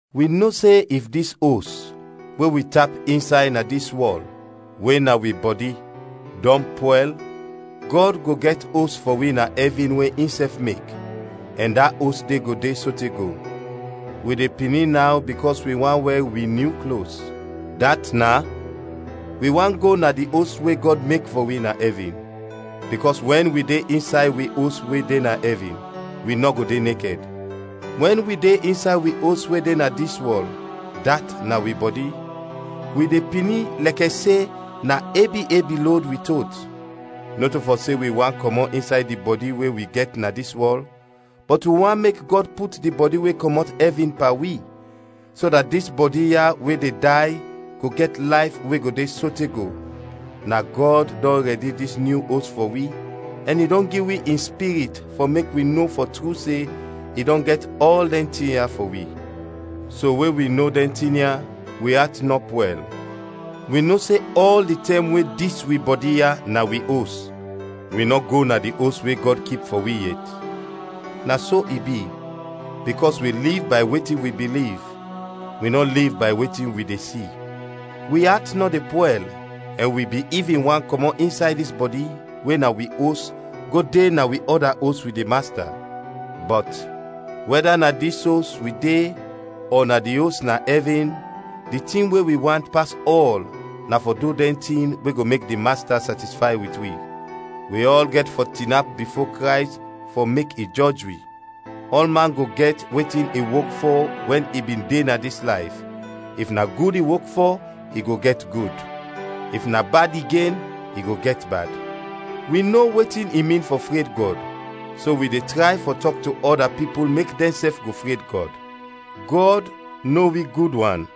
Wi no se if dis os, we wi tap insay na dis wɔl, we na wi bɔdi, dɔn pwɛl, Gɔd go gɛt os fɔ wi na ɛvin we insɛf mek, ɛn da os de go de sote go. Wi de pini naw bikɔs wi want wɛr wi nyu klos, dat is, wi want go na di os we Gɔd mek fɔ wi na ɛvin, bikɔs wɛn wi de insay wi os we de na ɛvin, wi nɔ go de nekɛd. Wɛn wi de insay wi os we de na dis wɔl, dat na wi bɔdi, wi de pini lɛkɛ se na ebi ebi lod wi tot; nɔto fɔ se wi want kɔmɔt insay di bɔdi we wi gɛt na dis wɔl, bɔt wi want mek Gɔd put di bɔdi we kɔmɔt ɛvin pan wi, so dat dis bɔdi ya we de day go gɛt layf we go de sote go. Na Gɔd dɔn rɛdi dis nyu os fɔ wi ɛn i dɔn gi wi in Spirit fɔ mek wi no fɔ tru se i dɔn gɛt ɔl dɛn tin ya fɔ wi. So we wi no dɛn tin ya, wi at nɔ pwɛl. Wi no se ɔl di tɛm we dis wi bɔdi ya na wi os, wi nɔ go na di os we Gɔd kip fɔ wi, yet. Na so i bi, bikɔs wi liv bay wetin wi biliv, wi nɔ liv bay wetin wi de si. Wi at nɔ de pwɛl ɛn wi bin ivin want kɔmɔt insay dis bɔdi we na wi os go de na wi ɔda os wit di Masta. Bɔt, wɛda na dis os wi de ɔ na di os na ɛvin, di tin we wi want pas ɔl na fɔ du dɛn tin we go mek di Masta satisfay wit wi. Wi ɔl gɛt fɔ tinap bifo Krays fɔ mek i jɔj wi. Ɔlman go gɛt wetin i wok fɔ wɛn i bin de na dis layf, if na gud i wok fɔ, i go gɛt gud; if na bad igen, i go gɛt bad. Wi no wetin i min fɔ fred Gɔd, so wi de tray fɔ tɔk to ɔda pipul mek dɛnsɛf go fred Gɔd. Gɔd no wi gud wan,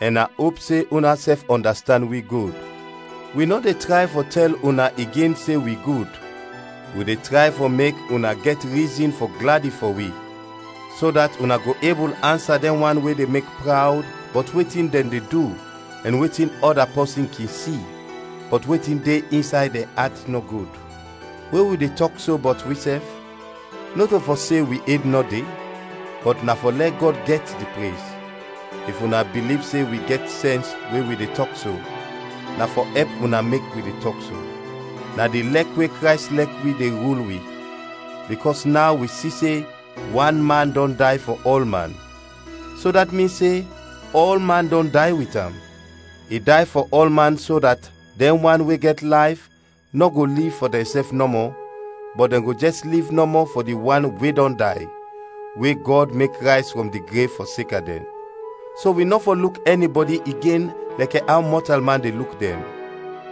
ɛn a op se unasɛf ɔndastand wi gud. Wi nɔ de tray fɔ tɛl una igen se wi gud; wi de tray fɔ mek una gɛt rizin fɔ gladi fɔ wi, so dat una go ebul ansa dɛn wan we de mek prawd bɔt wetin dɛn de du ɛn wetin ɔda pɔsin kin si, bɔt wetin de insay dɛn at nɔ gud. We wi de tɔk so bɔt wisɛf, nɔto fɔ se wi ed nɔ de, bɔt na fɔ lɛ Gɔd gɛt di prez. If una biliv se wi gɛt sɛns we wi de tɔk so, na fɔ ɛp una mek wi de tɔk so. Na di lɛk we Krays lɛk wi de rul wi, bikɔs naw wi si se wan man dɔn day fɔ ɔlman, so dat min se ɔlman dɔn day wit am. I day fɔ ɔlman so dat dɛn wan we gɛt layf nɔ go liv fɔ dɛnsɛf nɔmɔ, bɔt dɛn go jɛs liv nɔmɔ fɔ di wan we dɔn day, we Gɔd mek rayz frɔm di grev fɔseka dɛn. So wi nɔ fɔ luk ɛnibɔdi igen lɛkɛ aw mɔtalman de luk dɛn.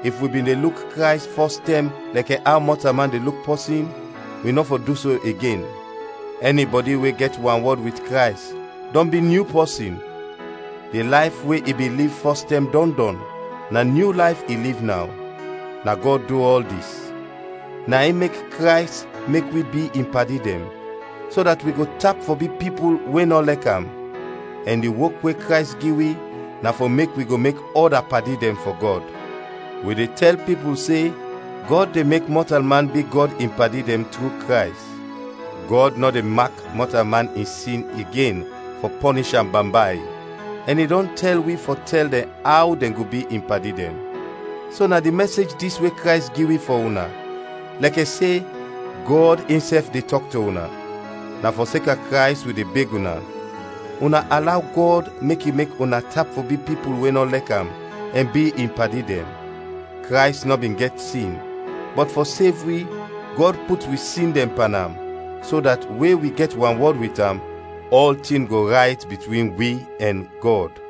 If wi bin de luk Krays fɔstɛm lɛkɛ aw mɔtalman de luk pɔsin, wi nɔ fɔ du so igen. Ɛnibɔdi we gɛt wanwɔd wit Krays, dɔn bi nyu pɔsin, di layf we i bin liv fɔstɛm dɔn dɔn, na nyu layf i liv naw. Na Gɔd du ɔl dis, na in mek Krays mek wi bi in padi dɛn, so dat wi go tap fɔ bi pipul we nɔ lɛk am, ɛn di wok we Krays gi wi na fɔ mek wi go mek ɔda padi dɛn fɔ Gɔd. Wi de tɛl pipul se Gɔd de mek mɔtalman bi Gɔd in padi dɛn tru Krays. Gɔd nɔ de mak mɔtalman in sin igen fɔ pɔnish am bambay, ɛn i dɔn tɛl wi fɔ tɛl dɛn aw dɛn go bi in padi dɛn. So na di mɛsej dis we Krays gi wi fɔ una, lɛkɛ se Gɔd insɛf de tɔk to una; na fɔseka Krays, wi de beg una: una alaw Gɔd mek i mek una tap fɔ bi pipul we nɔ lɛk am, ɛn bi in padi dɛn. Krays nɔ bin gɛt sin, bɔt fɔ sev wi, Gɔd put wi sin dɛn pan am, so dat we wi gɛt wanwɔd wit am, ɔltin go rayt bitwin wi ɛn Gɔd.